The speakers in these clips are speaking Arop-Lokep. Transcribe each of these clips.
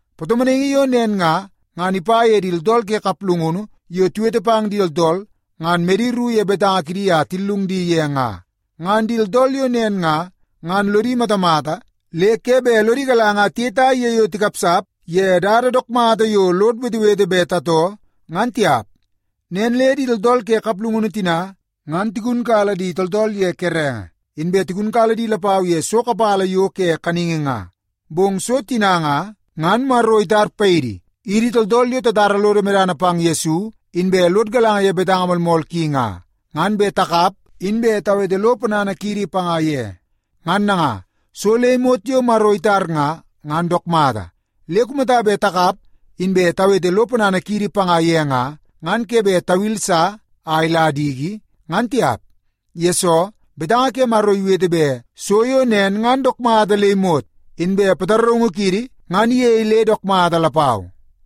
Patomonaingi yo nen nga, ngan ipa ye di tooltool ke kaplungunu yo tiwete pang di tooltool, ngan medi ru ye betanga kidi a tillung di ye nga. Ngan di tooltool yo nen nga, ngan lodi matamata le ke bet lodi galanga a tiyetai ye yo tikapsap ye dada dook mata yo lod wetewete bet tatoo, ngan tiap. Nen le di tooltool ke kaplungunu tina, ngan tigunkala di tooltool ye kerenge, inbe tigunkala di lapau ye so kapala yo ke kaningi nga. Bong so tina nga, ngan Maro itar paidi, idi tooltool yo tatara lodo medana pang Yesu inbe lod galanga ye betanga moolmool ki nga, ngan bet takap inbe tawete lo ponana kiidi panga ye. Ngan nanga, so le imot yo Maro itar nga, ngan dook mata. Le kumata bet takap inbe tawete lo ponana kiidi panga ye nga, ngan ke bet tawili sa a ila diki, ngan tiap. Yesoo, betanga ke Maro iwete bet so yo nen ngan dook mata le imot. Inbe pataraungu kiidi ngan iyei le dook mata lapau.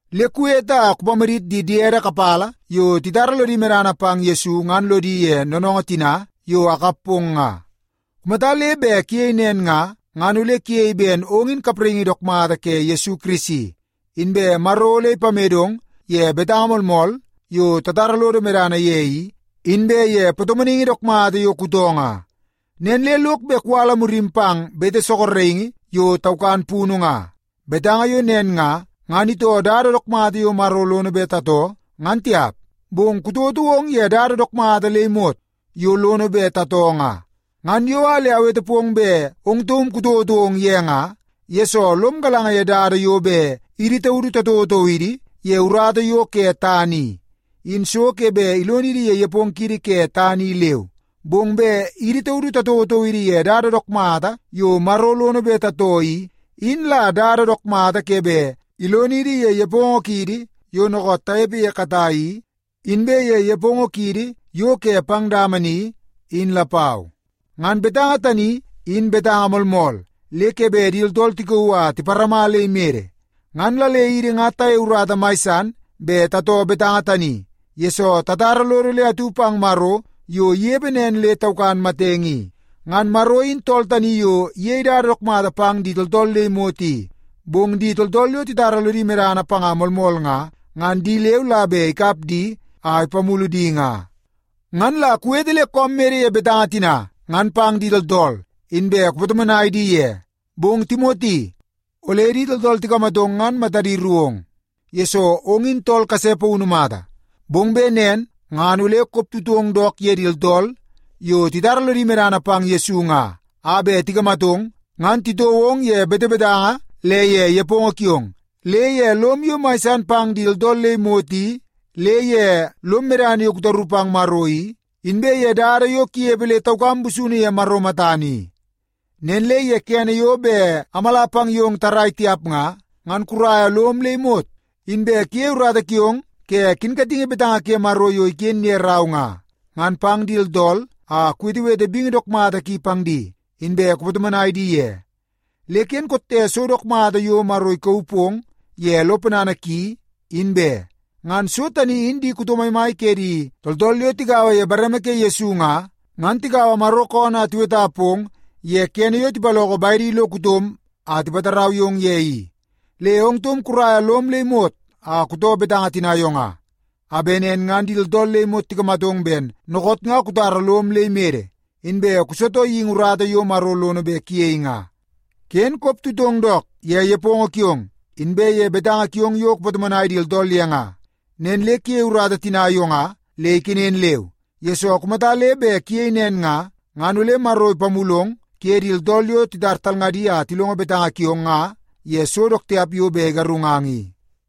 Le kuwete a kupamadit di diede kapala yo titara lodi medana pang Yesu ngan lodi ye noonoongoo tina yo akap pong nga. Kumata le bet kuyei nen nga, ngan ole kuyei ben ong in kapraingi dook mata ke Yesu Kirisi. Inbe Maro ole ipamedong ye betanga moolmool yo tatara lodo medana ye i, inbe ye patomonaingi dook mata yo kutoo nga. Nen le lok bet kuwala murim pang bete sorokingi yo taukan punu nga. Betanga yo nen nga, ngan itoo dada dook mata yo Maro lono bet tatoo, ngan tiap. Bong kutouotou ong ye dada dook mata le imot yo lono bet tatoo nga. Ngan yo a le awete pong bet ong taum kutouotou ong ye nga, yesoo lom galanga ye dada yo bet idi taudu tatouotou idi ye urata yo ke tana i, in so ke bet ilonidi ye nepongo kiidi ke tana i leu. Bong bet idi taudu tatouotou idi ye dada dook mata yo Maro lono bet tatoo i, in la dada dook mata ke bet ilonidi ye nepongo kiidi yo dookoot tanepe ye katai i, inbe ye nepongo kiidi yo ke pang dama ni, in lapau. Ngan betanga tani, in betanga moolmool le ke bet di tooltool tikauu a tiparama le imede. Ngan la le idi nga tayei urata mai san bet tatoo betanga tani, yesoo tatara lodo le atu pang Maro yo inepe nen le taukan matenge i. Ngan Maro in tool tani yo iyei dada dook mata pang di tooltool le imot i. Bong di tooltool yo titara lodi medana panga moolmool nga, ngan di leu la bet ikap di a ipamulu di nga. Ngan la kuwete le koom mede ye betanga tina ngan pang di tooltool, inbe kupatomonai di ye. Bong Timoti, ole di tooltool tikamatong ngan matadi ru ong, yesoo ong in tool kase paunu mata. Bong bet nen ngan ole koptutong dook ye di tooltool yo titara lodi medana pang Yesu nga a bet tikamatong, ngan titoo ong ye betebetanga le ye nepongo kiong, le ye lom yo mai san pang di tooltool le imot i, le ye lom medana yo kutaru pang Maro i, inbe ye dada yo kunepe le taukam busunu ye Maro matana i. Nen le ye kene yo bet amala pang yong tarrai tiap nga, ngan kuraia lom le imot inbe kuyei urata kiong ke kinkatingi betanga ke Maro yo iken ye rau nga, ngan pang di tooltool a kuwetewete bingi dook mata ki pang di, inbe kupatomonai di ye. Le ken kotte so dook mata yo Maro ikauu pong ye lo ponana ki, in be. Ngan so tani in di kuto maimai ke di tooltool yo tigaua ye bareme ke Yesu nga, ngan tikaua Maro koonoo a tiweta pong ye kene yo tipaloko bedi lo kutom a tipatarau yong ye i. Le ong taum kuraia lom le imot a kutoo betanga tina yo nga, a bet nen ngan di tooltool le imot tikamatong ben dookoot nga kutara lom le imede, inbe kusitoo geingi urata yo Maro lono bet kuyei nga. Ken koptutong dook ye nepongo kiong inbe ye betanga kiong yo kupatomonai di tooltool ye nga. Nen le kuyei urata tina yo nga le ikenen leu, yesoo kumata le bet kuyei nen nga, ngan ole Maro ipamulong kuye di tooltool yo titar talngadi a tilongo betanga kiong nga ye so dook tiap yo bet igarungang i.